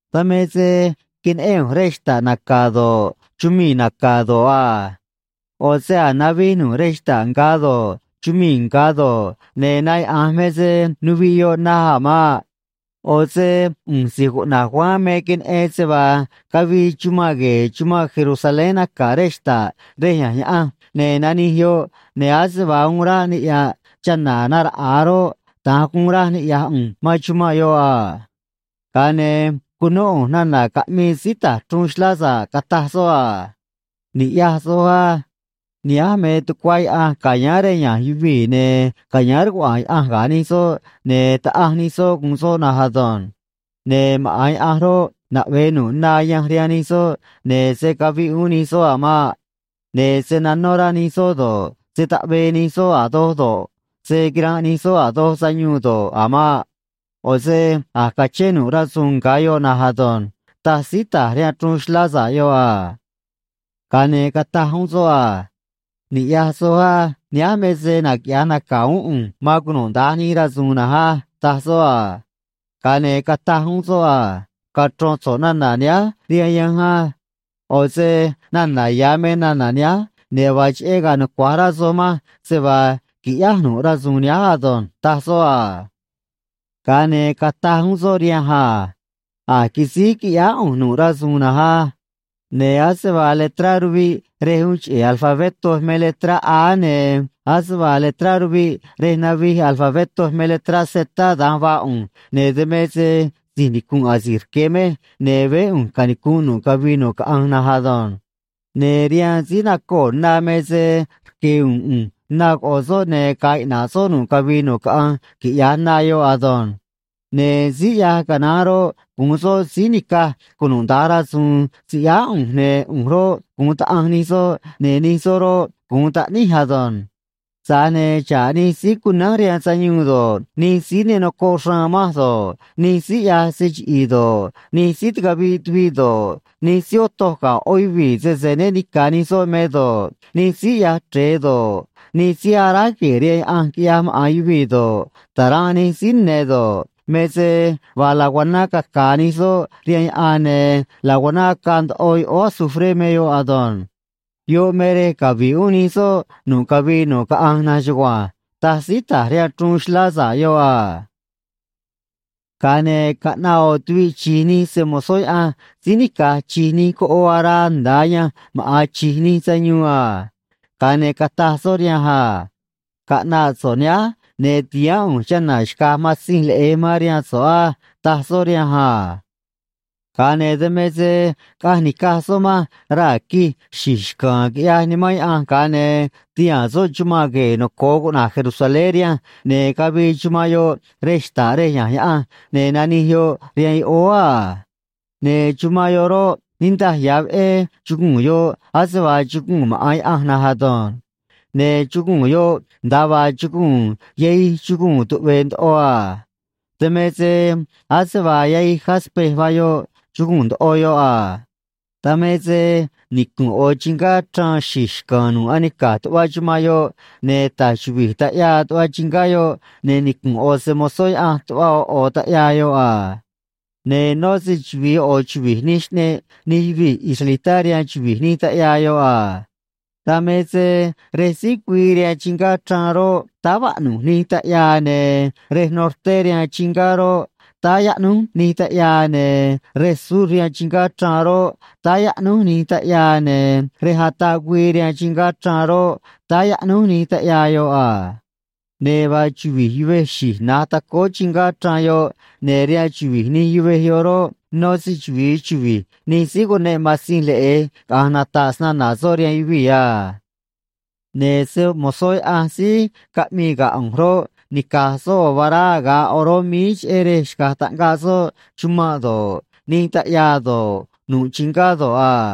Dan me se queneꞌén ꞌu̱nj rej xta̱ꞌ naca̱ do̱ꞌ, chumii̱ naca̱ do̱ꞌ a. ꞌO̱ se a̱j navij nu̱ꞌ rej xta̱ꞌ nga̱ do̱ꞌ, chumii̱ nga̱ do̱ꞌ, ne̱ na yaꞌa̱nj me se nuviꞌ yoꞌ naj a̱ maꞌ. ꞌO̱ se ꞌu̱nj si̱j cuꞌna̱j Juan me queneꞌen se vaa cavii chumanꞌ gue̱e̱ chumanꞌ Jerusalén naca̱ rej xta̱ꞌ rej ya̱nj Yaꞌanj, ne̱ nanij yoꞌ, ne̱ ase vaa uun ráꞌ niꞌya̱ꞌ chana̱ naraꞌa̱a roꞌ, da̱nj guun raj niꞌya̱j ꞌu̱nj man chumanꞌ yoꞌ a. Ga̱a ne̱ cunó ꞌu̱nj nana̱ caꞌmii síí ta̱j chruun xlá sa̱ꞌ, cataj soꞌ a: ―Ni̱ꞌyaj soj á. Nihánj me tucuá Yaꞌanj ca̱yáán rej ya̱nj yuvii̱, ne̱ ca̱yáán rcuaꞌa̱a̱n Yaꞌanj ga̱ nij soꞌ, ne̱ Taꞌanj nij soꞌ gu̱un soꞌ na̱nj ado̱nj. Ne̱ maꞌa̱n Yaꞌanj roꞌ, naꞌve̱ nu̱ꞌ na ayanj rihaan nij soꞌ, ne̱ se̱ caviꞌ uún nij soꞌ a̱ maꞌ. Ne̱ se̱ nanó rá nij soꞌ do̱ꞌ, se̱ taꞌvee nij soꞌ a̱ doj do̱ꞌ, se̱ quiranꞌ nij soꞌ a̱ doj sayuun do̱ꞌ, a̱ maꞌ. ꞌO̱ se a̱j cachén nu̱ꞌ rasu̱u̱n nga̱ yoꞌ na̱nj ado̱nj ―taj síí ta̱j rihaan chruun xlá sa̱ꞌ yoꞌ a. Ga̱a ne̱ cataj uún soꞌ a: ―Ni̱ꞌyaj soj á. Nihánj me se naquiꞌya̱j naca̱ uún ꞌu̱nj man cunuda̱nj nij rasu̱u̱n na̱nj á ―taj soꞌ a. Ga̱a ne̱ cataj uún soꞌ a: ―Cachro̱n so̱ꞌ nana̱ nihánj rihaan yanj á. ꞌO̱ se nana̱ ya̱ me nana̱ nihánj, ne̱ vaa cheꞌé ga̱a̱ nucua̱j rá soj manj se vaa qui̱ꞌyáj nu̱ꞌ rasu̱u̱n nihánj ado̱nj ―taj soꞌ a. Ga̱a ne̱ cataj uún soꞌ rihanj a: ―A̱j quisíj quiꞌyáá ꞌu̱nj nu̱ꞌ rasu̱u̱n na̱nj á. Ne̱ ase vaa letrá ruviꞌ rej uun cheꞌe̱ alfabetó me letrá A, ne̱ ase vaa letrá ruviꞌ rej navij alfabetó me letrá Z, da̱nj vaa ꞌu̱nj, ne̱ dan me se si̱j nicu̱nꞌ asi̱j rque̱ mej, ne̱ veé ꞌu̱nj canicu̱nꞌ nu̱ꞌ cavii nu̱ꞌ caꞌanj na̱nj ado̱nj. Ne̱ rihaan síí nacoo̱ na me se rque̱ u̱u̱n ꞌu̱nj na coꞌo̱ soꞌ, ne̱ ga̱a̱ iꞌna̱ꞌ soꞌ nu̱ꞌ cavii nu̱ꞌ caꞌanj, quiꞌya̱j na yoꞌ ado̱nj. Ne̱ síí ꞌyaj canaán roꞌ, gu̱un soꞌ síí ni̱caj cunuda̱nj rasu̱u̱n siꞌyáá ꞌu̱nj, ne̱ ꞌu̱nj roꞌ, gu̱un Taꞌanj nij soꞌ, ne̱ nij soꞌ roꞌ, gu̱un taꞌníj ado̱nj. Tza̱j ne̱ xa̱ꞌ nij síí cunánj rihaan sayuun do̱ꞌ, nij síí ne nocoꞌ xraan manj do̱ꞌ, nij síí ꞌyaj se chiꞌi̱i̱ do̱ꞌ, nij síí ticaviꞌ tuviꞌ do̱ꞌ, nij síí otoj ga̱ ꞌó yuvii̱ sese né ni̱ca̱ nij soꞌ me do̱ꞌ, nij síí ꞌyaj chre̱e do̱ꞌ, nij síí aráj gue̱e̱ rihaan yaꞌanj quiꞌyaj maꞌa̱n yuvii̱ do̱ꞌ, ta̱ranꞌ nij síí ne̱ do̱ꞌ, me se vaa laguaná caca̱a̱ nij soꞌ rihaan yaꞌan, ne̱ laguaná acaa ndoꞌo yoꞌóó azufré me yoꞌ ado̱nj. Yoꞌ me rej cavi̱ꞌ uún nij soꞌ nu̱ꞌ cavii nu̱ꞌ caꞌanj na̱nj chugua̱nj ―taj síí ta̱j rihaan chruun xlá sa̱ꞌ yoꞌ a. Ga̱a ne̱ caꞌnaꞌ ꞌo̱ tuviꞌ chi̱j nij se‑mo̱zó Yaꞌanj síí nica̱j chi̱j nij coꞌoo araa nda̱a ayanj maꞌa̱n chi̱j nij sayuun a. Ga̱a ne̱ cataj soꞌ rihanj a: ―Caꞌna̱ꞌ so̱ꞌ nihánj, ne̱ ti̱haán ꞌu̱nj chana̱ xca̱j Matzinj Leꞌe̱j man rihaan so̱ꞌ á ―taj soꞌ rihanj a. Ga̱a ne̱ dan me se caꞌanj nica̱j soꞌ manj raa̱ quij xi̱j xca̱a̱n, quiꞌyaj Nimán Yaꞌanj, ga̱a ne̱ tihaa̱n soꞌ chumanꞌ gue̱e̱ noco̱o cuꞌna̱j Jerusalén rihanj, ne̱ cavii chumanꞌ yoꞌ rej xta̱ꞌ rej ya̱nj Yaꞌanj, ne̱ nanij yoꞌ rihaan yoꞌóó a. Ne̱ chumanꞌ yoꞌ roꞌ, niꞌndaj ya̱ veꞌé chuguu̱n yoꞌ ase vaa chuguu̱n maꞌa̱n Yaꞌanj na̱nj ado̱nj. Ne̱ chuguu̱n yoꞌ nda̱a vaa chuguu̱n yahij chuguu̱n tuꞌve̱e̱ ndoꞌo a. Dan me se ase vaa yahij “jaspe” vaa yoꞌ, chuguu̱n ndoꞌo yoꞌ a. Dan me se nicu̱nꞌ ꞌo̱ chingá chraan xi̱j xca̱a̱n nu̱ꞌ anica̱j tuꞌva chumanꞌ yoꞌ, ne̱ ta̱j chuvi̱j taꞌyaa tuꞌva chingá yoꞌ, ne̱ nicu̱nꞌ ꞌo̱ se‑mo̱zó Yaꞌanj tuꞌva ꞌo̱ ꞌo̱ taꞌyaa yoꞌ a. Ne̱ nó se‑chuvi̱i ꞌo̱ chuvi̱j nij xꞌneꞌ nij yuvii̱ israelitá rihaan chuvi̱j nij taꞌyaa yoꞌ a. Dan me se rej síj güii rihaan chingá chraan roꞌ, táá vaꞌnu̱j nij taꞌyaa, ne̱ rej norté rihaan chingá roꞌ, táá yaꞌnúj nij taꞌyaa, ne̱ rej sur rihaan chingá chraan roꞌ, táá yaꞌnúj nij taꞌyaa, ne̱ rej ataꞌ güii rihaan chingá chraan roꞌ, táá yaꞌnúj nij taꞌyaa yoꞌ a. Ne̱ vaa chuvi̱j yuvej xi̱j na̱j tacóó chingá chraan yoꞌ, ne̱ rihaan chuvi̱j nij yuvej yoꞌ roꞌ, nó se‑chuvi̱i chuvi̱j nij síí cuneꞌ Matzinj Leꞌe̱j caꞌa̱nj nata̱ꞌ snana̱ soꞌ rihaan yuvii̱ a. Ne̱ se‑mo̱zó Yaꞌanj síí caꞌmii ga̱ ꞌu̱nj roꞌ, nica̱j soꞌ ꞌo̱ vará aga̱ꞌ oró míí, cheꞌé rej xca̱j taꞌngaꞌ soꞌ chumanꞌ do̱ꞌ, nij taꞌyaa do̱ꞌ, nu̱ꞌ chingá do̱ꞌ a.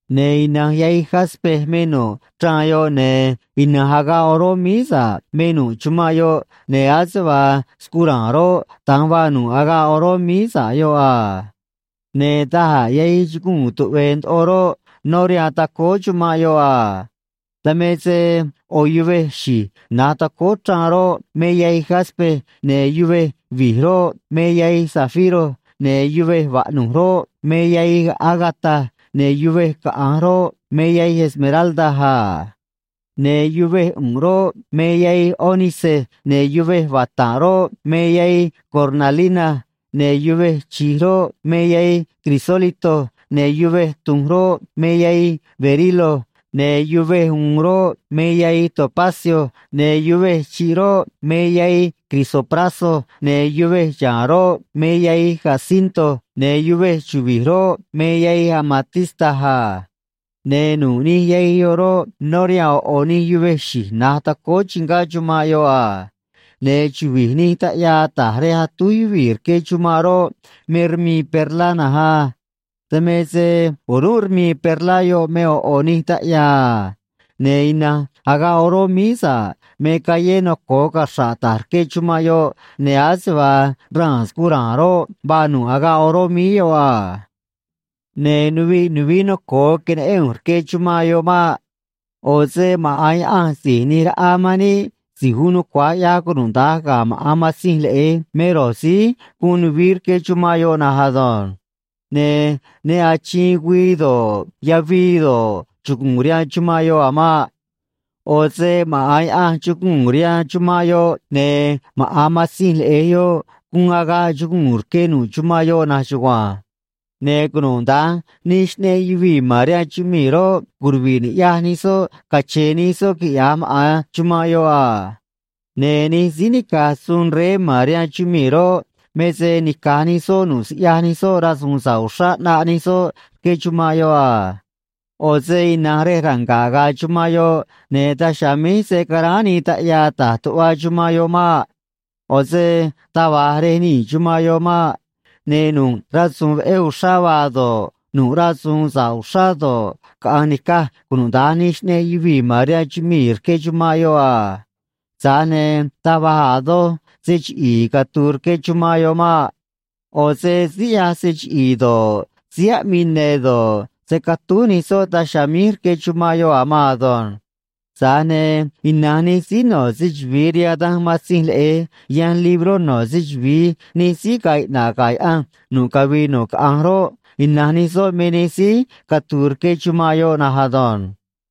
Ne̱ ina̱nj yahij “jaspe” me nu̱ꞌ chraan yoꞌ, ne̱ ina̱nj agaꞌ oró míí sa̱ꞌ me nu̱ꞌ chumanꞌ yoꞌ, ne̱ ase vaa scura̱a̱n roꞌ, da̱nj vaa nu̱ꞌ agaꞌ oró míí sa̱ꞌ yoꞌ a. Ne̱ da̱j a̱ yahij chuguu̱n tuꞌve̱e̱ ndoꞌo roꞌ, nó rihaan tacóó chumanꞌ yoꞌ a. Dan me se ꞌo̱ yuvej xi̱j na̱j tacóó chraan roꞌ, me yahij “jaspe”, ne̱ yuvej vi̱j roꞌ, me yahij “zafiro”, ne̱ yuvej vaꞌnu̱j roꞌ, me yahij “ágata”, ne̱ yuvej caꞌa̱nj roꞌ, me yahij “esmeralda” a. Ne̱ yuvej ꞌu̱nꞌ roꞌ, me yahij “ónice”, ne̱ yuvej vata̱nꞌ roꞌ, me yahij “cornalina”, ne̱ yuvej chi̱j roꞌ, me yahij “crisólito”, ne̱ yuvej tu̱nj roꞌ, me yahij “berilo”, ne̱ yuvej u̱u̱n roꞌ, me yahij “topacio”, ne̱ yuvej chi̱ꞌ roꞌ, me yahij “crisopraso”, ne̱ yuvej xa̱a̱n roꞌ, me yahij “jacinto”, ne̱ yuvej chuvi̱j roꞌ, me yahij “amatista” a. Ne̱ nu̱ꞌ nij yahij yoꞌ roꞌ, nó rihaan ꞌo̱ ꞌo̱ nij yuvej xi̱j na̱j tacóó chingá chumanꞌ yoꞌ a. Ne̱ chuvi̱j nij taꞌyaa ta̱j rej atúj yuvii̱ rque chumanꞌ roꞌ, me rmii perlá na̱nj a. Dan me se o̱rúnꞌ rmii perlá yoꞌ me ꞌo̱ ꞌo̱ nij taꞌyaa a. Ne̱ ina̱nj agaꞌ oró míí sa̱ꞌ me callé noco̱o caxra̱ꞌ ta̱j rque chumanꞌ yoꞌ, ne̱ ase vaa raa̱n scura̱a̱n roꞌ, vaa nu̱ꞌ agaꞌ oró míí yoꞌ a. Ne̱ nuviꞌ nuvií noco̱o queneꞌén ꞌu̱nj rque chumanꞌ yoꞌ maꞌ. ꞌO̱ se maꞌa̱n Yaꞌanj Si̱j ꞌNi̱j Raꞌa man níꞌ Si̱j Uun Nucua̱j ꞌYaj Cunuda̱nj ga̱ maꞌa̱n Matzinj Leꞌe̱j me ro̱j síí guun nuvií rque chumanꞌ yoꞌ na̱nj ado̱nj. Ne̱ ne achiin güii do̱ꞌ, yavii do̱ꞌ, chugu̱u̱n rihaan chumanꞌ yoꞌ a̱ maꞌ. ꞌO̱ se maꞌa̱n Yaꞌanj chuguu̱n rihaan chumanꞌ yoꞌ, ne̱ maꞌa̱n Matzinj Leꞌe̱j yoꞌ guun agaꞌ chuguu̱n rque nu̱ꞌ chumanꞌ yoꞌ na̱nj chugua̱nj. Ne̱ cunuda̱nj nij xꞌneꞌ yuvii̱ ma̱n rihaan chumii̱ roꞌ, curuvi̱ꞌ ni̱ꞌyaj nij soꞌ cache̱e̱ nij soꞌ, quiꞌya̱j maꞌa̱n chumanꞌ yoꞌ a. Ne̱ nij síí nica̱j suun rey ma̱n rihaan chumii̱ roꞌ, me se nica̱j nij soꞌ nu̱ꞌ siꞌyaj nij soꞌ rasu̱u̱n sa̱ꞌ uxrá, ꞌnaꞌ nij soꞌ rque chumanꞌ yoꞌ a. ꞌO̱ se ina̱nj rej ranga̱ꞌ ga̱a̱ chumanꞌ yoꞌ, ne̱ daj chiha̱a̱ míj se̱ caráán nii taꞌyaa ta̱j tuꞌva chumanꞌ yoꞌ maꞌ. ꞌO̱ se taj va̱j rej nii̱ chumanꞌ yoꞌ maꞌ. Ne̱ nu̱ꞌ rasu̱u̱n veꞌé uxrá vaa do̱ꞌ, nu̱ꞌ rasu̱u̱n sa̱ꞌ uxrá do̱ꞌ, caꞌa̱nj ni̱caj cunuda̱nj nij xꞌneꞌ yuvii̱ ma̱n rihaan chumii̱ rque chumanꞌ yoꞌ a. Tza̱j ne̱ taj va̱j a̱ doj se chiꞌi̱i̱ catu̱u̱ rque chumanꞌ yoꞌ maꞌ. ꞌO̱ se síí ꞌyaj se chiꞌi̱i̱ do̱ꞌ, síí aꞌmii ne̱ do̱ꞌ, se̱ catúj nij soꞌ daj chiha̱a̱ míj rque chumanꞌ yoꞌ a̱ maan ado̱nj. Tza̱j ne̱ ina̱nj nij síí no̱ se‑chuvi̱i rihaan danj Matzinj Leꞌe̱j yanj libró no̱ se‑chuvi̱i nij síí ga̱a̱ iꞌna̱ꞌ ga̱ Yaꞌanj nu̱ꞌ cavii nu̱ꞌ caꞌanj roꞌ, ina̱nj nij soꞌ me nij síí catu̱u̱ rque chumanꞌ yoꞌ na̱nj ado̱nj.